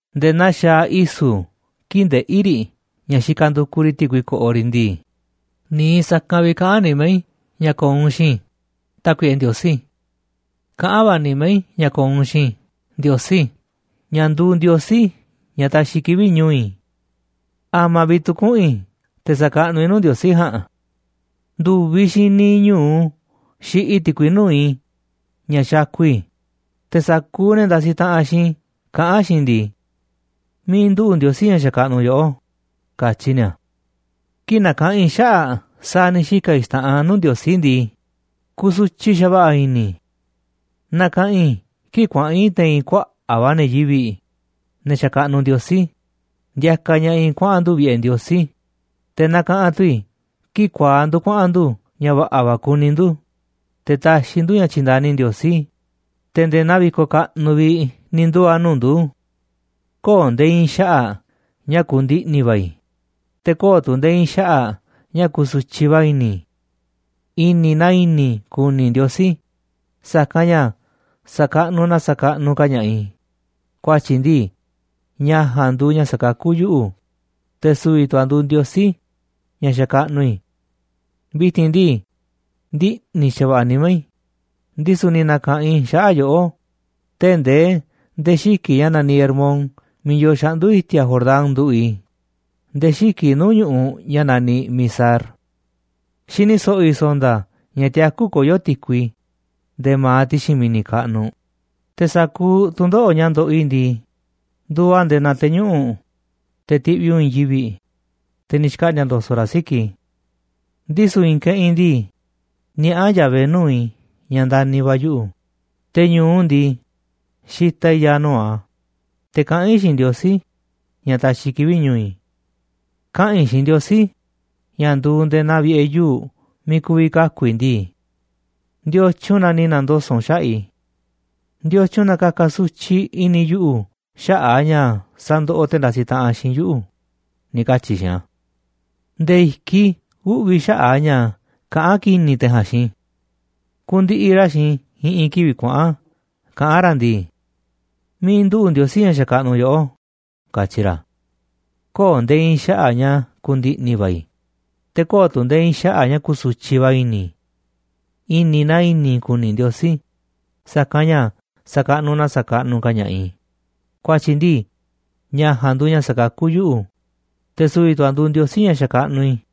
Nde̱e̱ naa xaaꞌ i̱su̱ kii̱ꞌ ndeꞌí riꞌ ña̱ xikaꞌ ndukuꞌ riꞌ ti̱kui ko̱ꞌo̱ riꞌ ndii, niiꞌ sa̱kanꞌ vi̱ꞌ kaꞌán nimá i̱ ña̱ ko̱o̱ u̱nꞌ xiinꞌ i̱, Tákuiꞌe Ndiosí. Kaꞌán va̱ nimá i̱ ña̱ ko̱o̱ u̱nꞌ xiinꞌ i̱, Ndiosí, ña̱ nduuꞌ Ndiosí ña̱ taxiꞌ kivi̱ꞌ ñu̱u̱ i̱. ¿A̱ma̱ vi̱ꞌ tu̱ kuꞌu̱n i̱ te̱ sakaꞌnuꞌ i̱ nuu̱ꞌ Ndiosí ja̱a̱nꞌ? Ndu̱viꞌ xiinꞌ niiꞌ ñu̱u xiꞌiꞌ i̱ ti̱kui nuu̱ꞌ i̱ ña̱ xakuꞌ i̱, te̱ sa̱kuuꞌ ne̱ ndasiꞌ taꞌanꞌ xiinꞌ i̱ kaꞌán xiinꞌ i̱ ndii: “¿Miiꞌ yoo Ndiosí ña̱ xakaꞌnuꞌ u̱nꞌ?”, katyi ni̱a̱. Kii̱ꞌ nakaꞌanꞌ i̱ xaꞌa̱ꞌ sa̱a̱ ni̱ xika̱ i̱ xta̱ꞌanꞌ nuu̱ꞌ Ndiosí ndii, kusutyiꞌ xa̱va̱ꞌa̱ i̱ni̱ i̱. Nakaꞌanꞌ i̱ kii̱ꞌ kuaꞌa̱n i̱ te̱i̱n kuaꞌa̱ꞌ va̱ ne̱ yivi̱ꞌ, ne̱ xakaꞌnuꞌ Ndiosí, ndiakaꞌ ña̱ꞌaꞌ i̱ kuaꞌa̱n ndu̱ vi̱ꞌe̱ Ndiosí, te̱ nakaꞌanꞌ tu̱ i̱ kii̱ꞌ kuaaꞌ ndu̱ kuaꞌa̱n ndu̱ ña̱ va̱ꞌa̱ va̱ kuni ndu̱, te̱ taxiꞌ ndu̱ ña̱ tyi̱nda̱ni Ndiosí, te̱ nde̱e̱ naa vi̱koꞌ kaꞌnuꞌ vi̱ꞌ ni̱ nduu̱ a̱ nuu̱ꞌ ndu̱. Köo̱ꞌ nde̱e̱ i̱i̱n xaꞌa̱ꞌ ña̱ ku̱ndi̱ꞌni̱ va̱ i̱, te̱ köo̱ꞌ tu̱ nde̱e̱ i̱i̱n xaꞌa̱ꞌ ña̱ ku̱su̱tyiꞌ va̱ i̱ni̱ i̱. I̱ni̱ na i̱ni̱ i̱ ku̱ni̱ Ndiosí, sa̱kanꞌ ña̱ sa̱kaꞌnuꞌ na sa̱kaꞌnuꞌ ka̱ ña̱ꞌaꞌ i̱, ku̱a̱tyi̱ ndii, ña̱ ja̱a̱nꞌ nduuꞌ ña̱ sakakú yuꞌu̱, te̱ su̱vi̱ tu̱ a̱ nduuꞌ Ndiosí ña̱ xakaꞌnuꞌ i̱. Vi̱ti̱n ndii, ndiꞌni̱ xa̱va̱ꞌa̱ nimá i̱, ndisu̱ ni̱ na̱ka̱ꞌanꞌ i̱ xaꞌa̱ꞌ yoꞌó tee̱ꞌ ndee nde̱e̱ xiki̱ꞌ ña̱ naniꞌ Hermón miiꞌ yoo xaꞌndu̱ i̱ti̱a̱ Jordán nduꞌu̱ꞌ i̱, nde̱e̱ xiki̱ꞌ nuu̱ꞌ ñu̱ꞌuꞌ ña̱ naniꞌ Mizar. Xini so̱ꞌo̱ i̱ so̱nda̱ ña̱ tiakú koyó ti̱kui nde̱e̱ ma̱aꞌ ti̱xi̱n mi̱ni̱ kaꞌnuꞌ, te̱ sa̱kuuꞌ tu̱ndoꞌo̱ꞌ ña̱ ndoꞌoꞌ i̱ ndii, nduuꞌ a̱ nde̱e̱ naa te̱ñuꞌu̱ꞌ, te̱ tiꞌviꞌ u̱nꞌ i̱i̱n yivi̱ꞌ, te̱ ni̱ xkaꞌndi̱a̱ ndo̱so̱ꞌ raꞌ siki̱ꞌ i̱. Ndisu̱ i̱i̱n keꞌinꞌ ndii, niaꞌá Yahvé nuu̱ꞌ i̱ ña̱ ndani̱ va̱ a̱ yuꞌu̱, te̱ ñu̱u ndii, xitaꞌ i̱ ya̱a̱ nuu̱ꞌ a̱, te̱ kaꞌán i̱ xiinꞌ Ndiosí ña̱ taxiꞌ kivi̱ꞌ ñu̱u̱ i̱. Kaꞌa̱n i̱ xiinꞌ Ndiosí, ña̱ nduuꞌ nde̱e̱ naa vi̱ꞌe̱ yuu̱ꞌ miiꞌ ku̱vi̱ kaku̱ i̱, ndii: “¿Ndiotyun na ni̱ na̱ndoso̱ꞌ u̱nꞌ xaꞌa̱ꞌ i̱? ¿Ndiotyun na ka̱ka̱ sutyiꞌ i̱ni̱ yuꞌu̱ xaꞌa̱ꞌ a̱ ña̱ sandoꞌoꞌ te̱ ndasiꞌ taꞌanꞌ xiinꞌ yuꞌu̱?”, ni̱ katyi̱ i̱ xiinꞌ a̱. Nde̱e̱ i̱kiꞌ i̱ uꞌvi̱ xaꞌa̱ꞌ a̱ ña̱ kaꞌán ki̱ni̱ te̱ ja̱a̱nꞌ xiinꞌ i̱. Kundiꞌiꞌ ra̱ xiinꞌ i̱ i̱ꞌi̱n kivi̱ꞌ kuaꞌa̱n kaꞌán ra̱ ndii: “¿Miiꞌ nduꞌu̱ꞌ Ndiosí ña̱ xakaꞌnuꞌ yoꞌó?”, katyi ra̱. Köo̱ꞌ nde̱e̱ i̱i̱n xaꞌa̱ꞌ ña̱ ku̱ndi̱ꞌni̱ va̱ i̱, te̱ köo̱ꞌ tu̱ nde̱e̱ i̱i̱n xaꞌa̱ꞌ ña̱ ku̱su̱tyiꞌ va̱ i̱ni̱ i̱. I̱ni̱ na i̱ni̱ i̱ ku̱ni̱ Ndiosí, sa̱kanꞌ ña̱ sa̱kaꞌnuꞌ na sa̱kaꞌnuꞌ ka̱ ña̱ꞌaꞌ i̱, ku̱a̱tyi̱ ndii, ña̱ ja̱a̱nꞌ nduuꞌ ña̱ sakakú yuꞌu̱, te̱ su̱vi̱ tu̱ a̱ nduuꞌ Ndiosí ña̱ xakaꞌnuꞌ i̱.